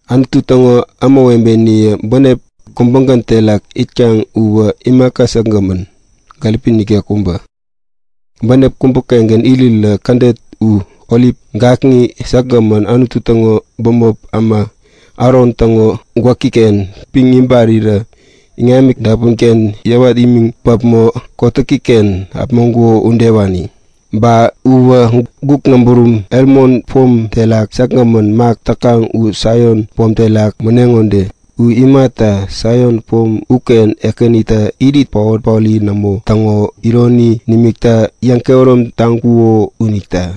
Anutu täŋo ämawebeniye bänep kubägän terak it täkaŋ uwä imaka säkgämän, gäripi nikek kubä. Bänep kubägän irit kädet u orip gakŋi säkgämän Anutu täŋo bämop äma Aron täŋo gwäkiken piŋ ibarirä iŋami dapunken yäwat imiŋ äpämaŋ kotäkiken äpuŋo udewani. Ba uwä guk näburum Hemon pom terak säkgämän mak täkaŋ u Saion pom terak mäneŋo ude. U imata, Saion pom uken Ekänitä irit paot-paori nämo täŋo ironi nimikta yäŋkehärom taŋkuko unita.